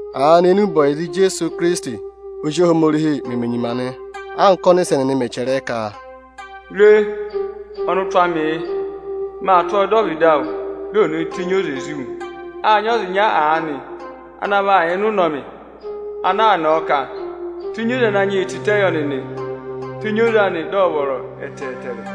Aanị énube ọyịza Ijeesu Ikirisiti Ozi Ohomorihi meme nyima nị, anka ọ́nịsẹ nịnị mẹ̀ chẹrẹ ẹ ka, “Re, ọnụtụ amị yị, maa tụ́ ọọ dọ ọvịdị awụ, di ò nee tenyi oze zí wu.” Â nyị ọza ịnya aanị ana yà ịnị ụnọmị ana aa nọọ ka, “Tenyi oze Ananyị yị tịtẹ yọ nịnị, tenyi oze anị, dị ọ̀ vọrọ ẹtẹẹtẹrẹ!”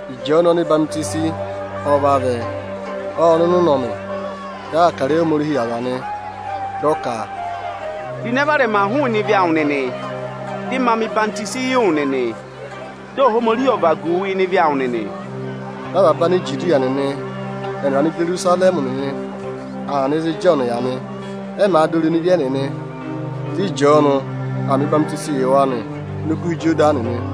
Ịjọọnụ ọhwọzenyi ọ vavẹ, ộ nọ ịnị ụnọmị, dị aa kà ịrẹyị Ohomorihi yị aza nị, dị ọ ka, “Ro ịnẹ varẹma hụụnị ebira odivi awụ nịnị, dị ma mẹ̀ ọyịhwọzenyi yị wụ nịnị, dị Ohomorihi ọ̀ vagu wu ịnị ịvị awụ nịnị!” Dị avaba Anijudiya nịnị ẹnịrị Anijerusarẹmị nịnị aa nọ ịzị Ịjọọnụ yà nị. Ẹ màa dọ irenu ịvị ẹnịnị, dị Ịjọọnụ aa mẹ ọyịhwenyii yị wa ini Okuha Ịjọdanị nị.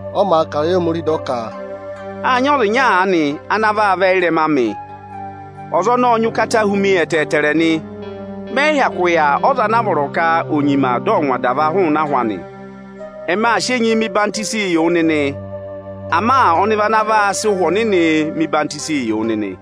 Ọ màa kà ịrẹyị Ohomorihi, dị ọ ka, “Â nyị ọza ịnya aanị ana vaa vẹ ị́rẹma amị. Ọza ọnọọ ọ nyị ụkata hu mi ẹtẹẹtẹrẹ nị. Mẹ yị hyakụ yà ọza ana vọrọ ka ò nyima dị ọ̀ ngwa adava hụụnị ahụ anị. Ẹmị aa sị enyi mẹ ọyịhwenyii yị wụ nịnị, ama ọnị vị ana vaa sị Ụhwẹ Ọnịnị mẹ̀ ọyịhwọzenyi yị wụ nịnị.”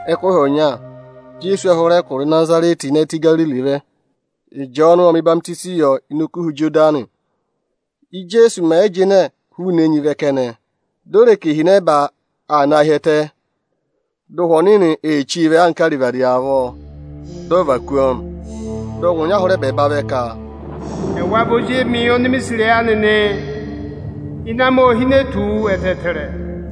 Ẹkụhị ọnya Ijeesu ộ hụrẹ ẹkụra Ịnazarẹtị ịnị ẹtẹ Igariri vẹ. Ịjọọnụ ộ mẹ̀ ọyịhwọzenyi yọ ini Okuha Ịjọdanị. Íjeesu mẹ̀ yị jịnẹ hụụnị enyi vẹ kẹnẹ, di o re ka ihinẹba aa naa hi ẹtẹ, dị Ụhwẹ Ọnịnị ee chí vẹ anka arivadi avọọ, di o ve kú ọọ nị. Dị ọngwẹ ọnya hụrẹ ẹbẹẹba vẹ ka, “Ẹwa vị Ozi emi oni mi sì ịrẹyị anị nị, ịnẹ amị ô hine tù wu ẹtẹẹtẹrẹ.”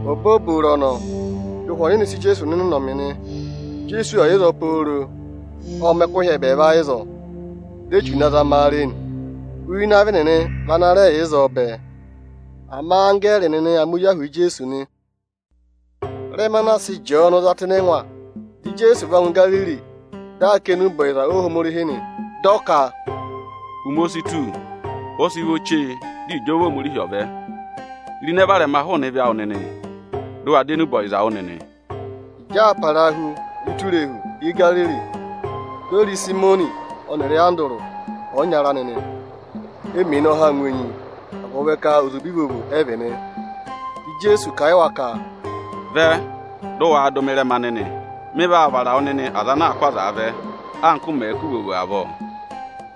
Obooboro ọnọọ dị Ụhwẹ Ọnịnị sị Ijeesu nọ ịnị ụnọmị nị. Ijeesu ộ yà ịzọọ pooro, ộ mẹ̀ ẹkụhị ẹbẹẹva ịzọọ. Dị Echu na zama a re nị. Uye ịnị avị nịnị vị ana rẹ yà ịzọọ bẹẹ, ama anggẹẹrị nịnị aa mẹ ozi ahụụ yị Ijeesu nị. Ịrẹma anaa sị Ịjọọnụ za tụ́ ịnị ẹngwa, dị Ijeesu va ngụ Igariri, dị aa kà enube ọyịza Ohomorihi nị, dị ọ ka, “Ụmẹ o si tù, ọ sị vọ chee, dị ịjọva Ohomorihi ọ̀ vẹ. Ro ịnẹ varẹma hụụnị ebira odivi awụ nịnị, dị ụ wa dọ enube ọyịza wụ́ nịnị!” Ịjị aa parahu ụtọ irehu Igariri, di o re Ịsayịmọnị ọnịrị Andụrụ ọyịnyara anị, e mèe ne ọhaa ngụ enyi, agụvị ka ozube ivovo ẹ vị nị. Dị Ijeesu kà a yị wa ka, “Vẹ, dị waa dụ mị ịrẹma nịnị! Mị vaa vara wụ nịnị aza anaā kụ́ azaa vẹ, anka ụ mẹ̀ẹ̄ kụ́ ivovo avọọ.”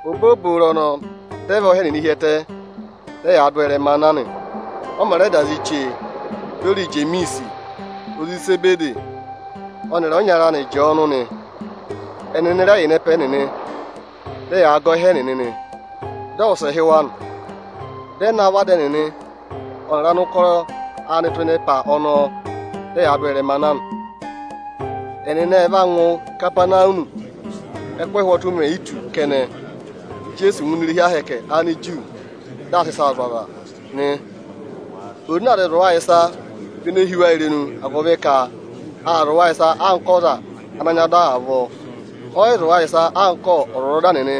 Obooboro ọnọọ dị ẹ và ọha ẹnịnị hi ẹtẹ, dị ẹyaa dụ ọ ịrẹmaa na nị. Ọ mẹ̀ rẹ da zị chee, di o re Ijemiisi, ozi Izebedi ọnịrị ọyịnyara anị Ịjọọnụ nị. Ẹnịnị vị ana yà ịnị ẹpa ẹnịnị, dị ẹyaa gẹ ọha ẹnịnị nị. Dị ọ wụsẹ hị́ wa nị, dị ẹ navọ ada ẹnịnị ọnịrị anụkọrọ anị tụ́ ịnị ẹpa ọnọọ, dị ẹyaa dị ụ ọọ ịrẹmaa na nị. Ẹnịnị ẹ va ngụ Ikapanawumi. Ẹ́kụhị ụhwọtụ mè yi tù kẹnẹ, dị Ijeesu ngụ ini irehi ahẹkẹ Aniju, dị aa sị ịsaa zụ̀ aza nị. Oze ana aa zịị zụ̀ wa ịsa vị ene hí wa irenu, agụvị ka aa zụ̀ wa ịsa anka ọza ana nyị ọda avọọ; ọ yị zụ̀ wa ịsa anka ọ́zwọzọda nịnị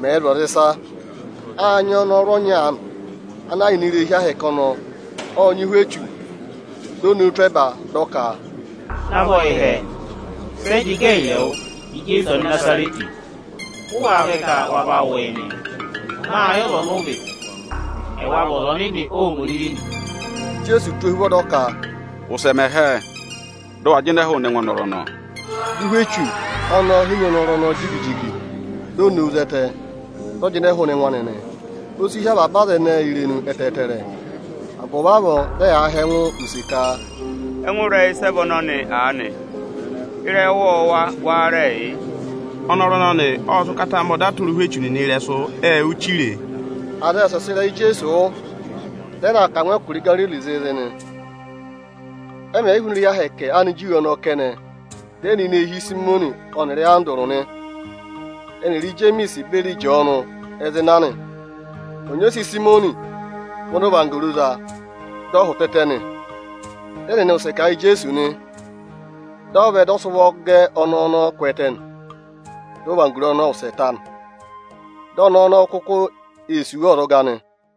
mẹ̀ẹ̄ zụ̀ aza ịsa. Â nyị ọnọrụ ọnya aanị ana yà ini irehi ahẹkẹ Aniju ọnọọ, ộ nyị ụhwẹ echu. Di o nowu tụ́ ẹba, dị ọ ka, “Navọ yị hẹẹ, sẹ jị gẹ ẹyịrị ẹwụ, Ijeesu Anịnazarẹtị? Ụ wáá vẹ ka wa va wụ yị nị? Mâ yẹ ọza ọnị ụ vị; ẹwa vị Ọza Ọnịnị Ohomorihi nị.” Dị Ijeesu tụ́ ọọ ohuvọ dị ọ ka, “Ụsẹ mẹ hẹẹ, dị ụ wa jịnẹ hụụnị ẹngụ ọnọrụ ọnọọ!” Dị ụhwẹ echu ọnọọ henyi ọnọrụ ọnọọ jigi-jigi, di o nowu zẹtẹ, dị ọ jịnẹ hụụnị ẹngụ anị nị. O si hí avaba aza ẹnẹẹ irenu ẹtẹẹtẹrẹ; agụvị avọọ dị ẹyaa họ̀ ẹngụ use ka, “Ẹngụ ịrẹyị sẹ vị ọnọnị aanị? Ịrẹyị ọwọọwa wáá rẹẹ yị? Ọnọrụ ọnọnị ộ sị ụkata mẹ ọda tụra ụhwẹ echu nịnị ịrẹsụ, ệ wụ́ chire e.” Aza ệ wụsẹ sị ịrẹyị Ijeesu wụ́, dị ẹ na aa kà a ngụ ẹkụra Igaririi zịịzị nị. Ẹ mẹ̀ yị hụụnị irehi ahẹkẹ Aniju ọnọọ kẹnẹ, dị ẹ nọ ini eehi Ịsayịmọnị ọnịrị Andụrụ nị, ẹnịrị Ijemiisi beri Ịjọọnụ ẹ zị na nị. Ọnyị ose Ịsayịmọnị vị ọnị ọvanggoro za, dị ọ hụtẹtẹ nị. Dị ẹnịnị wụsẹ kà a yị Ijeesu nị. Dị ọ vẹ, dị ọ sị ụvọ gẹ ọnẹẹ ọnọọ kwẹẹtẹ nị. Dị ọvanggoro anị ọnọọ ộ wụsẹ ta, dị o sì wa ọzọga nị.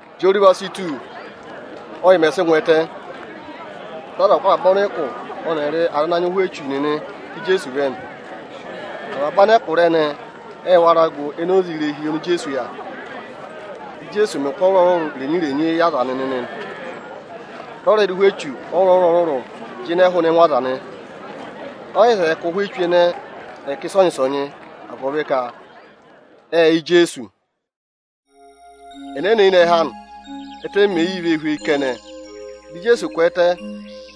Ịjị oruva si tù, ọ́ yị mẹ̀ sị ngụ ẹtẹ, dị aza kụ́ avaba ọnịkụ ọnịrị aza ana nyị ụhwẹ echu nịnị ká Ijeesu vẹ nị. Avaba anẹkụra ẹnẹẹ ệ wara gụ enoze irehi oni Ijeesu yà. Ijeesu ộ mẹ̀ aza ọrụrụ-ọrụrụ ụkụ irenyi-irenyi ana za wa. Dị ọ rẹ dụ ụhwẹ echu ọrụrụ-ọrụrụ jịnẹ hụụnị ẹngụ aza nị. Ọ yị zẹẹ ka ụhwẹ echu ẹnẹẹ ẹ̀ kà ịsọnyị-ịsọnyị, agụvị ka ệ yẹ Ijeesu. Ẹnẹnẹ eyinẹhẹ anị, ẹ́tẹ mèe yii vee hweyi kẹnẹ dị Ijeesu kwẹẹtẹ,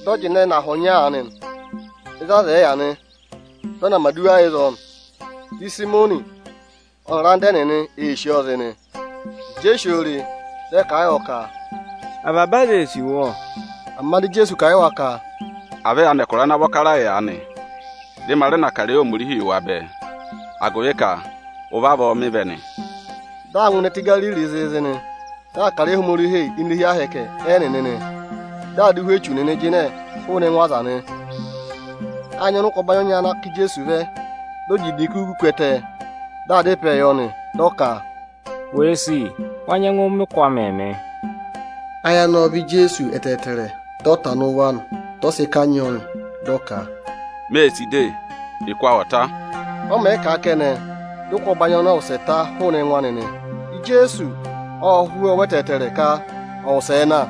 dị ọ jịnẹ nọ aha ọnya aanị ịzị aza ẹ̀ yị yà nị, dị ọ na mẹ̀ aduwa ịzọọ nị. Dị Ịsayịmọnị ọnịrị anda ẹnịnị ee sì ọọ zị nị. Ịjị e si oo re, dị ẹ kà a yọ ka, “Avaba aza ee sì wu ọ.” Ama dị Ijeesu kà a yị wa ka, “À vẹ ya nọ ịnị ẹkụra ana vọ kara yị aanị, dị ma rẹ na kà ịrẹyị Ohomorihi yị wa bẹẹ; agụvị ka ụvị avọọ mị vẹ nị.” Dị aa ngụ ẹtẹ Igariri zịịzị nị, dị aa kà ịrẹyị Ohomorihi ini irehi ahẹkẹ Aniju ẹnịnị, dị aa dụ ụhwẹ echu nịnị jịnẹ hụụnị ẹngụ aza nị. Â nyị ọnịkụ ọbanyị ọnya ana ká Ijeesu vẹ, dị ọ jị idinku ku ẹtẹ, dị aa dá ịpẹẹ yọ nị. Dị ọ ka, “Wèe sì, wa nyẹngụ mẹ ụkụ amịị mị.” Ayị anị ộ vá Ijeesu ẹtẹẹtẹrẹ. Dị ọ tana ụvọ anị, dị ọ sị kanyị ọọ nị, dị ọ ka, “Mê sì de, ụkụ awụ ọ̀ ta!” Ọ mẹ̀ yị kà a kẹnẹ, dị ụkụ ọbanyị ọnọọ wụsẹ ta hụụnị ẹngụ anị nị. Ijeesu ô hú ọọ ụvọ ẹtẹẹtẹrẹ ka ọ̀ wụsẹẹ na;